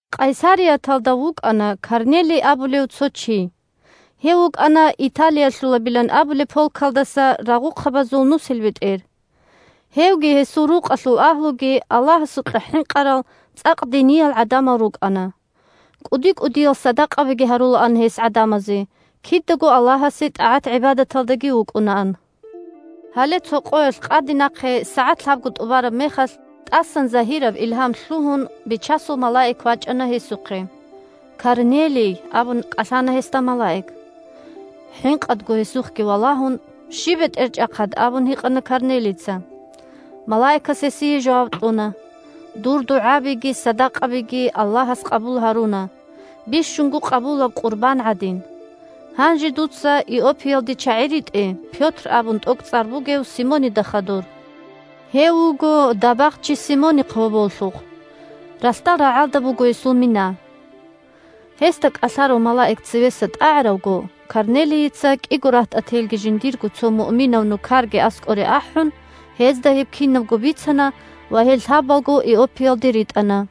Къайсарияталда вукӀана Корнелий абулев цо чи. Гьев вукӀана Италиялъулабилан абулеб полкалдаса рагъухъабазул нусилбетӀер. Гьевги гьесул рукъалъул агьлуги Аллагьасукьа хӀинкъарал, цӀакъ диниял гӀадамал рукӀана. КӀуди-кӀудиял садакъабиги гьарулаан гьес гӀадамазе, кидаго Аллагьасе тӀагӀат-гӀибадаталдаги вукӀунаан. Гьале цо къоялъ къаденахъе сагӀат лъабго тӀубараб мехалъ, тӀасан загьираб илгьам лъугьун, Бичасул малаик вачӀана гьесухъе. – Корнелий! – абун кӀалъана гьесда малаик. ХӀинкъадго гьесухъги валагьун: – Щиб, бетӀерчӀахъад? – абун гьикъана Корнелийица. Малаикас гьесие жаваб кьуна: – Дур дугӀабиги садакъабиги Аллагьас къабул гьаруна, бищунго къабулаб къурбан гӀадин. Гьанже дуца Иоппиялде чагӀи ритӀе Пётр абун тӀокӀцӀар бугев Симонида хадур. Гьев вуго дабагъчи Симонихъ гьоболлъухъ. Ралъдал рагӀалда буго гьесул мина. Гьесда кӀалъарав малаик цевеса тӀагӀаравго, Корнелийица кӀиго рагьтӀателги жиндирго цо муъминав нукарги аскӀоре ахӀун, гьезда гьеб кинабго бицана ва гьел лъабалго Иоппиялде ритӀана.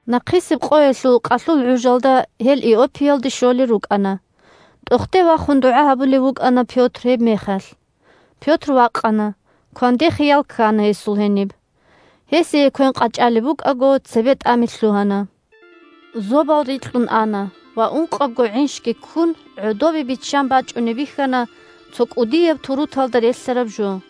Нахъисеб къоялъул къалъул гӀужалда гьел Иоппиялде щолел рукӀана. ТӀохде вахун дугӀа гьабулев вукӀана Пётр гьебмехалъ. Пётр вакъана, кванде хиял ккана гьесул гьениб. Гьесие квен къачӀалеб букӀаго, цебетӀами лъугьана: зобал рикьун ана ва ункъабго гӀинщги ккун гӀодобе биччан бачӀунеб бихьана цо кӀудияб туруталда релълъараб жо.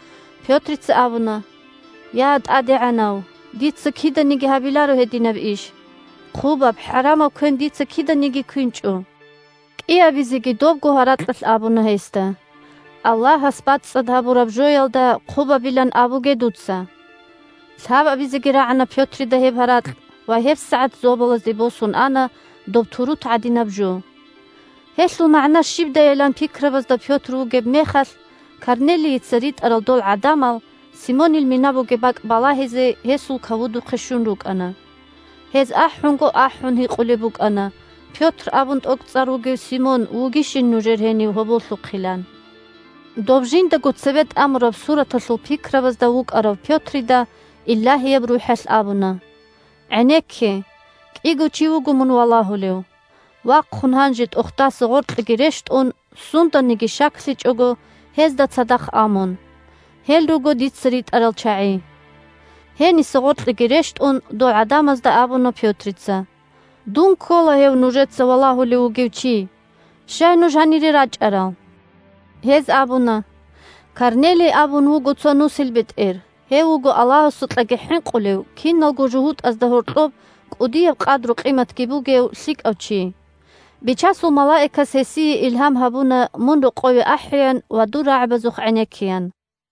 Пётрица абуна: – Я, ТӀадегӀанав, дица киданиги гьабиларо гьединаб иш. Хъубаб, хӀарамаб квен дица киданиги квинчӀо. КӀиабизеги добго гьаракьалъ абуна гьесда: – Аллагьас бацӀцӀад гьабураб жоялда хъубабилан абуге дуца. Лъабабизеги рагӀана Пётрида гьеб гьаракь ва гьебсагӀат зобалазде босун ана доб турут гӀадинаб жо. Гьелъул магӀна щибдайилан пикрабазда Пётр вугеб мехалъ, Корнелийица ритӀарал дол гӀадамал, Симонил мина бугеб бакӀ балагьизе гьесул кавудухъе щун рукӀана. Гьез ахӀунго-ахӀун гьикъулеб букӀана Пётр абун тӀокӀцӀар бугев Симон вугищин нужер гьенив гьоболлъухъилан. Доб жиндаго цебетӀамураб сураталъул пикрабазда вукӀарав Пётрида Илагьияб РухӀалъ абуна: – ГӀенекке, кӀиго чи вуго мун валагьулев. Вахъун гьанже тӀохдаса гъоркьеги рещтӀун, сунданиги щаклъичӀого, гьезда цадахъ а мун. Гьел руго дица ритӀарал чагӀи. Гьениса гъоркьеги рещтӀун, дол гӀадамазда абуна Пётрица: – Дун ккола гьев нужеца валагьулев вугев чи. Щай нуж гьанире рачӀарал? Гьез абуна: – Корнелий абун вуго цо нусилбетӀер, гьев вуго Аллагьасукьаги хӀинкъулев, киналго жугьутӀазда гьоркьоб кӀудияб къадру-къиматги бугев лъикӀав чи. Бичасул малаикас гьесие илгьам гьабуна мун рокъове ахӀеян ва дур рагӀабазухъ гӀенеккеян.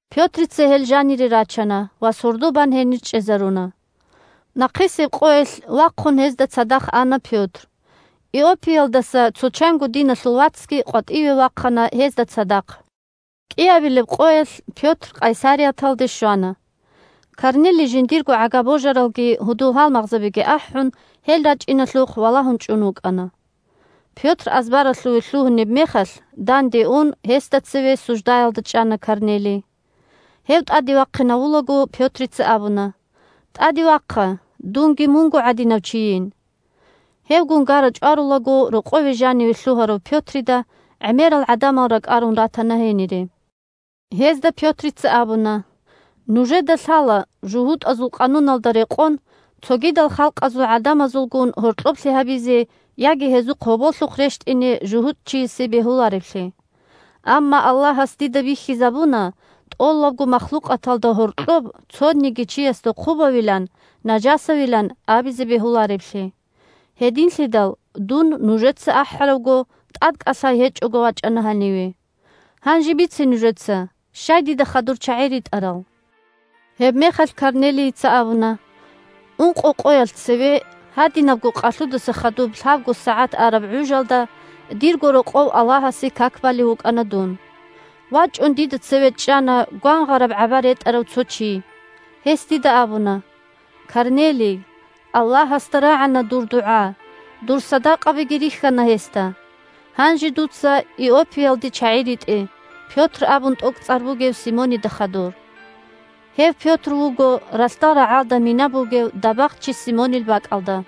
Пётрица гьел жанире рачана ва сордо бан гьенир чӀезаруна. Нахъисеб къоялъ вахъун гьезда цадахъ ана Пётр. Иоппиялдаса цо чанго диналъул вацги къватӀиве вахъана гьезда цадахъ. КӀиабилеб къоялъ Пётр Къайсарияталде щвана. Корнелий, жиндирго гӀага-божаралги гьудул-гьалмагъзабиги ахӀун, гьел рачӀиналъухъ валагьун чӀун вукӀана. Пётр азбаралъуве лъугьунеб мехалъ, данде ун гьесда цеве суждаялда чӀана Корнелий. Гьев тӀаде вахъинавулаго, Пётрица абуна: – ТӀаде вахъа, дунги мунго гӀадинав чийин. Гьевгун гара-чӀварулаго рокъове жаниве лъугьарав Пётрида гӀемерал гӀадамал ракӀарун ратана гьенире. Гьезда Пётрица абуна: – Нужеда лъала жугьутӀазул къануналда рекъон цогидал халкъазул гӀадамазулгун гьоркьоблъи гьабизе яги гьезухъ гьоболлъухъ рещтӀине жугьутӀчиясе бегьулареблъи. Амма Аллагьас дида бихьизабуна тӀолабго махлукъаталда гьоркьоб цониги чиясда хъубавилан, нажасавилан абизе бегьулареблъи. Гьединлъидал дун, нужеца ахӀаравго, тӀадкӀалъай гьечӀого вачӀана гьаниве. Гьанже бице нужеца: щай дида хадур чагӀи ритӀарал? Гьебмехалъ Корнелийица абуна: – Ункъо къоялъ цеве, гьадинабго къалъудаса хадуб лъабго сагӀат араб гӀужалда дирго рокъов Аллагьасе как балев вукӀана дун. ВачӀун дида цеве чӀана гвангъараб гӀаба ретӀарав цо чи. Гьес дида абуна: «Корнелий, Аллагьасда рагӀана дур дугӀа, дур садакъабиги рихьана гьесда. Гьанже дуца Иоппиялде чагӀи ритӀе Пётр абун тӀокӀцӀар бугев Симонида хадур. Гьев Пётр вуго ралъдал рагӀалда мина бугев дабагъчи Симонил бакӀалда».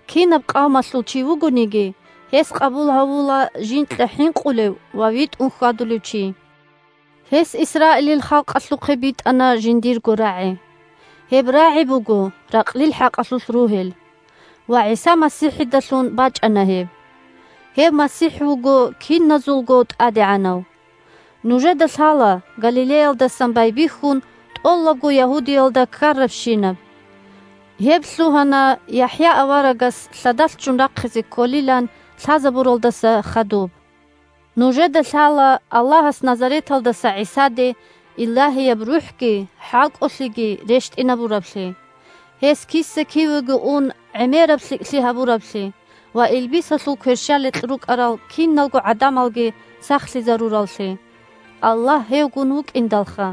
Кинаб къавмалъул чи вугониги, гьес къабул гьавула жинкьа хӀинкъулев ва витӀун хьвадулев чи. Гьес Исраилил халкъалъухъе битӀана жиндирго рагӀи. Гьеб рагӀи буго ракълил хӀакъалъулъ ругьел, ва ГӀиса МасихӀидалъун бачӀана гьеб. Гьев МасихӀ вуго киназулго ТӀадегӀанав. Нужеда лъала Галилеялдасан байбихьун тӀолабго Ягьудиялда ккарабщинаб. Гьеб лъугьана ЯхӀя аварагас лъадалъ ччун рахъизе кколилан лъазабуралдаса хадуб. Нужеда лъала Аллагьас Назареталдаса ГӀисаде Илагьияб РухӀги хӀалкӀолъиги рещтӀинабураблъи, гьес киса-кивего ун гӀемераб лъикӀлъи гьабураблъи ва илбисалъул кверщаликь рукӀарал киналго гӀадамалги сахлъизарураллъи, – Аллагь гьевгун вукӀиндалха!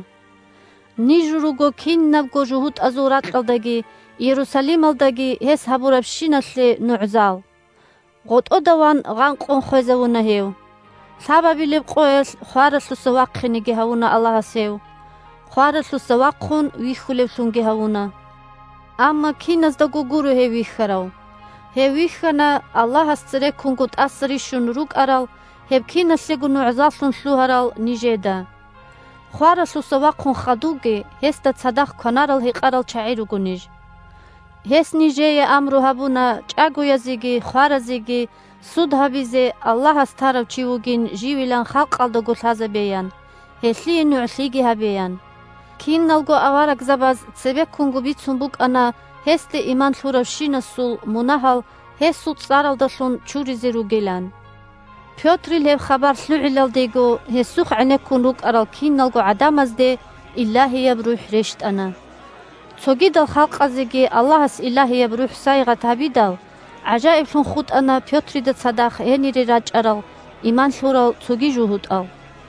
Ниж руго кинабго жугьутӀазул ракьалдаги Иерусалималдаги гьес гьабурабщиналъе нугӀзал. ГъотӀода ван гъанкъун хвезавуна гьев. Лъабабилеб къоялъ хваралъуса вахъинеги гьавуна Аллагьас гьев, хваралъуса вахъун вихьулевлъунги гьавуна. Амма киназдаго гуро гьев вихьарав. Гьев вихьана Аллагьас цереккунго тӀаса рищун рукӀарал, гьеб киналъего нугӀзаллъун лъугьарал нижеда. Хваралъуса вахъун хадувги гьесда цадахъ кванарал-гьекъарал чагӀи руго ниж. Гьес нижее амру гьабуна чӀагоязеги хваразеги суд гьабизе Аллагьас тарав чи вугин живилан халкъалдаго лъазабеян, гьелъие нугӀлъиги гьабеян. Киналго аварагзабаз цебеккунго бицун букӀана гьесде иман лъуравщинасул мунагьал гьесул цӀаралдалъун чуризе ругилан. Пётрил гьеб хабар лъугӀилалдего гьесухъ гӀенеккун рукӀарал киналго гӀадамазде Илагьияб РухӀ рещтӀана. Цогидал халкъазеги Аллагьас Илагьияб РухӀ сайигъат гьабидал, гӀажаиблъун хутӀана Пётрида цадахъ гьенире рачӀарал иман лъурал цоги жугьутӀал.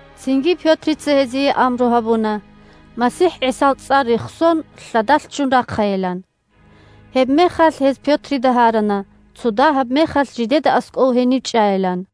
Цинги Пётрица гьезие амру гьабуна, МасихӀ ГӀисал цӀар рехсон, лъадалъ ччун рахъайилан. Гьебмехалъ гьез Пётрида гьарана цо дагьаб мехалъ жидеда аскӀов гьенив чӀайилан.